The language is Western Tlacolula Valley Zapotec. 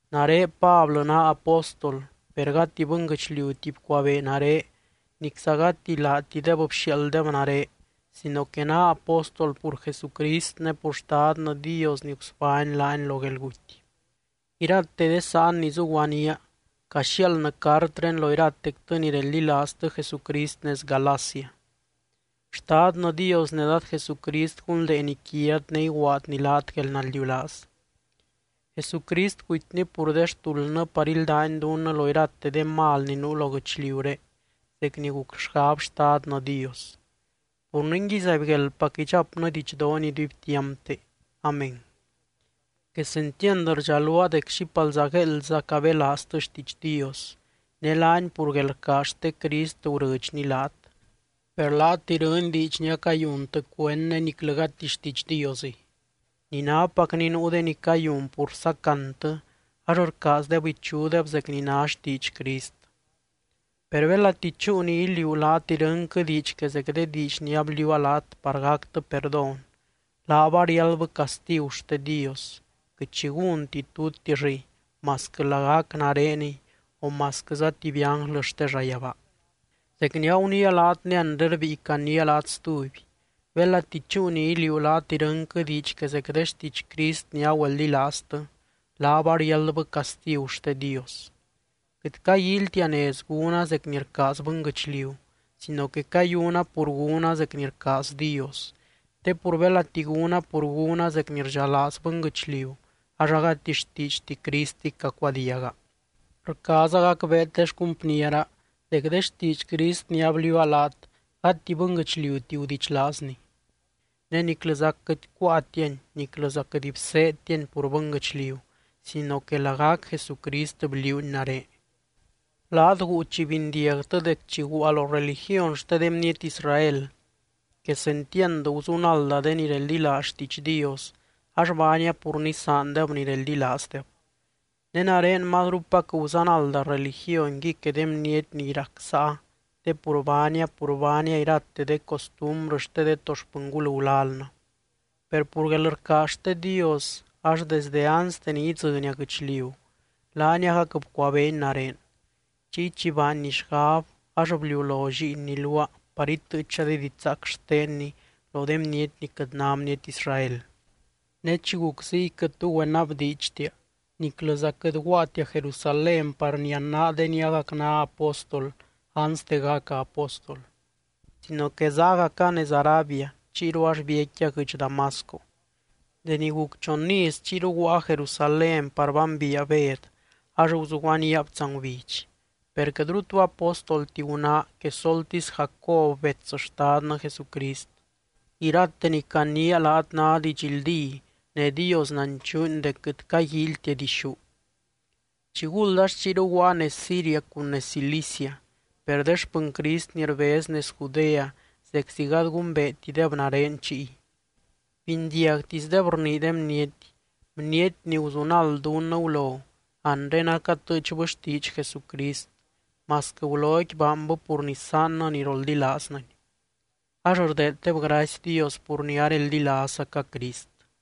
Nare Pablɨ naa apóstol (per gati bɨnguɨchliuti bcuabee nare nicza gati laatideb bxiaalddeb nare sino que naa apóstol pur Jesucrist ne pur Xtadnɨ Dios ni gusbány laany lo guelguty). Irate de sáan ni zuguaníaa caxiaaldnɨ cartré lo iratectɨ ni reldilaaztɨ Jesucrist nez Galacia. Xtadnɨ Dios ne Dad Jesucrist gunldeeny quiat ne iguaadny laat guelnaldiulaaz. Jesucrist gutyny pur de xtuldnɨ par íldany dunnɨ lo irate de mal ni nuu lo guɨchliuré zec ni guc xgab Xtadnɨ Dios. Pur ningui, ¡zaibgueldpac idxapnɨ didxdoony iduibtiampte! Amén. Quesentiand rdxaluaa dec xípalza gueeldza cabelaaztɨ xtiidx Dios, ne laany pur guelrcaaz xte Crist gurɨdxny laat. Per laat irɨny diidx ni acayuntɨ cuend ne niclɨ gati xtiidx Diosɨy. Ni nápacni nuu de ni cayun pur sacantɨ ax rcaazdeb ichudeb zec ni ná xtiidx Crist. Per belati chúu ni iliuu laat irɨnquɨ diidx que zec de diidx ni abliuua laat par gactɨ perdón, laab ariáldbɨ castigu xte Dios, quɨt xi gúnti tutixɨy masquɨ lagac nareniy o masquɨza tuby ánglɨ xte llayabaa. Zec ni aguniia laat ne anre rbíi caniia laat stuby: belati chúu ni iliuu laat irɨnquɨ diidx que zec de xtiidx Crist ni agüeldilaaztɨ, laab ariáldbɨ castigu xte Dios. Quɨt caguíilytia nez gúna zec ni rcaaz bɨnguɨchliu sino que cayuna pur gúna zec ni rcaaz Dios. Te pur belati gúna pur gúna zec ni rdxalaaz bɨnguɨchliu ax agati xtiidxti Cristiy cacuadiaga. Rcaaza gacbeet de xcumpniera, dec de xtiidx Crist ni abliuua laat gati bɨnguɨchliuti gudichlaazni. Ne niclɨza quɨt cuáatiani niclɨza quɨt bseedtiani pur bɨnguɨchliu sino que lagac Jesucrist bliuuni nare. Laat guu chi bindiagtɨ dec chi guua lo religiony xte de bniety Israel, quesentiand guzunalda de ni reldilaaz xtiidx Dios ax baania pur nisaandeb ni reldilaazdeb. Ne nare mazrupac guzanalda religionqui que de bniety ni rac sáa te pur baania pur baania irate de costumbrɨ xte de to xpɨngul gulalnɨ. Per pur guelrcaaz xte Dios ax desdɨ anste ni idzɨnia guɨchliu, laany agac bcuabeeny nare. Chiy chi baanny xgab ax bliulo Lliinny luaa par itɨɨcha de didxzaac xtenny lo de bniety ni quɨt ná bniety Israel. Ne chi guc ziy quɨt tu güenabdiidxtia niclɨza quɨt guaatia Jerusalén par nianaa de ni agac ná apóstol anste gaca apóstol, sino que zágaca nez Arabia chiyru ax biecquia guɨdx Damasco. Deni guc chon iz chiyru guaa Jerusalén par bambiia Bed ax guzuguaníab tsangubidx. Per quɨtru tu apóstolti gunáa quesoltisy Jacob bets Xtadnɨ Jesucrist. Irate ni caniia laat ná didxldí ne Dios nanchuuny dec quɨt caguíilytia dixú. Chiguld ax chiyru guaa nez Siria cun nez Cilicia. Per de xpɨny Crist ni rbez nez Judea zeczi gady gumbeetideb nare chiy. Bindiagtisdeb rnii de bniety: “Bniety ni guzunald dunnɨ gulo anre acatɨɨchbɨ xtiidx Jesucrist masquɨ guloqui baanbɨ pur nisaannɨ ni roldilaaznɨny.” Ax rdeeddeb gracy Dios pur ni areldilaazzaca Crist.